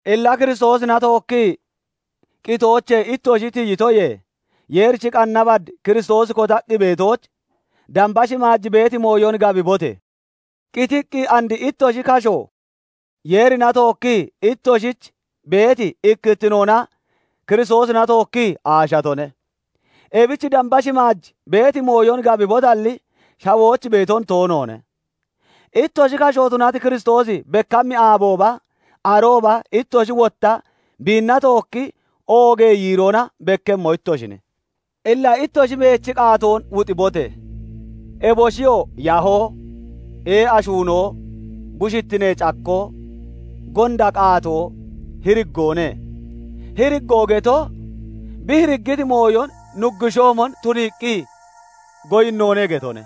Illa Kiristoosina tookkii qitoochee ittoshi tiyitoyee, Yeerichi qanna bad Kiristoosi kotaqqi beetooch damba shimaaj beeti mooyon gabibote! Qitiqqi and ittoshi kasho Yeerina tookkii ittoshich beeti ikkittinoona Kiristoosina tookkii aashatone. Ebich damba shimaaj beeti mooyon gabibotalli, shawooch beeton toonoone. Ittoshi kasho tunati Kiristoosi bekkammi aabooba, arooba ittoshi wotta biinna tookki oogee yiiroona bekkemmo ittoshine. Illa ittoshi meechi qaatoon wuxibote! Eboshiyoo yahoo, ee'a shuunoo, bushittinee cakkoo, gonda qaatoo, hiriggoone. (Hiriggoo geto, bi hiriggiti mooyon nuggushoomon tuniiqqi goyinnoone getone.)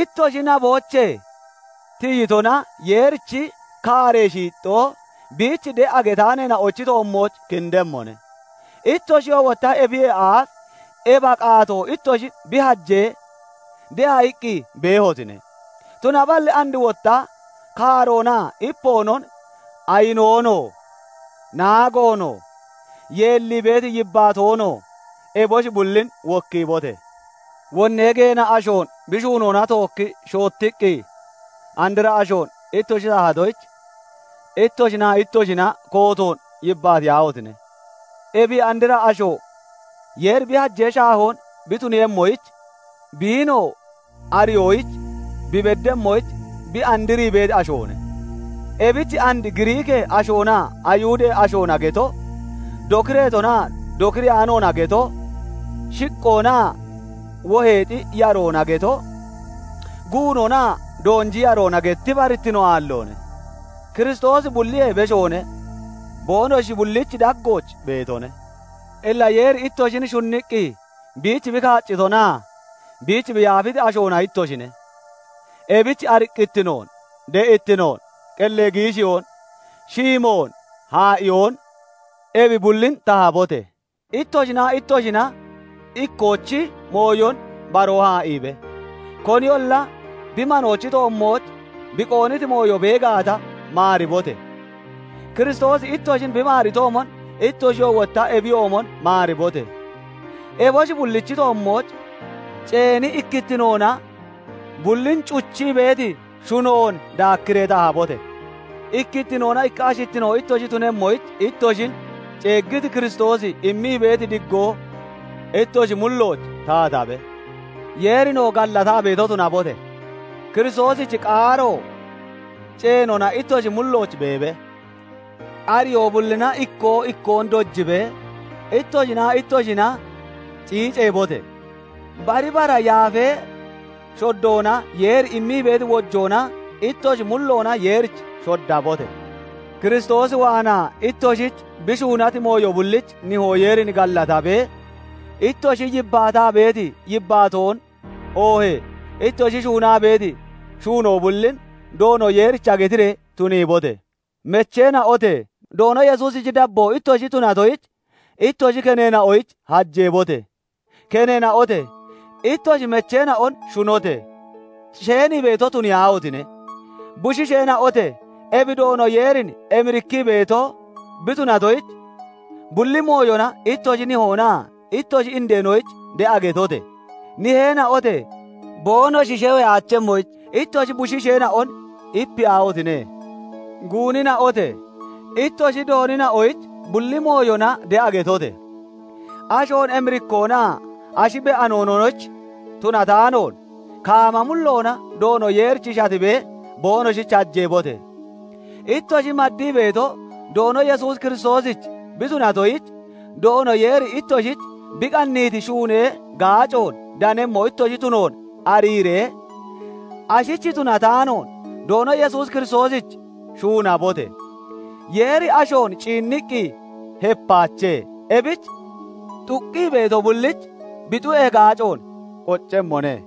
Ittoshi naboochee tiyitona Yeerichi kaaree shiixxoo biich de'a getaaneena'ochi toommooch kindemmone. Ittoshiyoo wotta ebiyee aaf ebi qaatoo ittoshin bi hajee, de'a iqqi beehotine; tunaballi and wotta kaaroonaa ipoonon, ayinoonoo, naagoonoo, yeellii beeti yibbaatoonoo, eboshi bullin wokkiibote! Wonnee geena ashoon bi shuunoona tookkii shoottiqqi, andra ashoon ittoshi tahatoyich ittoshinaa ittoshina kootoon yibbaatiyaahotine! Ebi andra asho Yeeri bi hajee shaahoon bi tunemmoyich, biinoo ariyooch bi beddemmoyich bi andrii beeti ashoone. Ebich and Giriikee ashoonaa Ayihudee ashoona geto, dokireetonaa dokireyaanoona geto, shiqqoonaa woheexi yaroona geto, guunonaa doonji yaroona geti barittino aalloone. Kiristoosi bulliyee beshoone; boonoshi bullichi daggooch beetone. Illa Yeeri ittoshin shunniqqi biich bi kaaccitonaa biich bi yaafiti ashoona ittoshine; ebich ariqqittinoon, de'ittinoon, qellee giishiyoon, shiimoon, haa'iyoon, ebi bullin tahabote! Ittoshinaa ittoshina ikkoochi mooyon baroo haa'iibe! Koniyolla bi manoochi toommooch bi qoonniti mooyo bee gaata, maaribote! Kiristoosi ittoshin bi maaritoomon ittoshiyoo wotta ebiyoomon maaribote! Eboshi bullichi toommooch ceeni ikkittinoona bullin cuchii beeti shunoon daakkiree tahabote! Ikkittinoona ikka ashittino ittoshi tunemmoyich ittoshin ceeggiti Kiristoosi immii beeti diggoo ittoshi mullooch taatabe. Yeerinoo gallataa beeto tunabote! Kiristoosichi qaaro ceenoona ittoshi mullooch beebe; ariyoo bullina ikkoo ikkoon dojibee, ittoshinaa ittoshina ciiceebote! Bari bara yaafee shoddoona Yeeri immii beeti wojoona ittoshi mulloona Yeerich shoddabote! Kiristoos waanaa ittoshich bi shuunati mooyo bullich Nihoo Yeerin gallatabee, ittoshi yibbaataa beeti yibbaatoon oohee ittoshi shuunaa beeti shuunoo bullin Doono Yesuusicha getiree tuniibote! Mecheena'ote! Doono Yesuusichi dabboo ittoshi tunatoyich ittoshi keneena'oyich hajeebote! Keneena'ote! Ittoshi mecheena'on shunote! Sheenii beeto tuniyaahotine! Bushiisheena'ote! Ebi Doono Yeerin emirikkii beeto bi tunatoyich, bulli mooyona ittoshi nihoonaa ittoshi indeenoyich de'a getote! Niheena'ote! Boonoshi sheweyaachemmoyich ittoshi bushiisheena'on ipiyaahotine! Guunina'ote! Ittoshi doonina'oyich bulli mooyona de'a getote! Ashoon emirikkoonaa ashi be'anoonoyich tunataanoon, kaama mulloona Doono Yeerich shatibee boonoshich hajeebote! Ittoshi maddii beeto Doono Yesuus Kiristoosich bi tunatoyich, Doono Yeeri ittoshich bi qanniiti shuunee gaacoon danemmo ittoshi tunoon ariiree, ashich tunataanoon Doono Yesuus Kiristoosich shuunabote! Yeeri ashoon ciinniqqi hepaache; ebich xuqqi beeto bullich bi xu'ee gaacoon qoccemmone.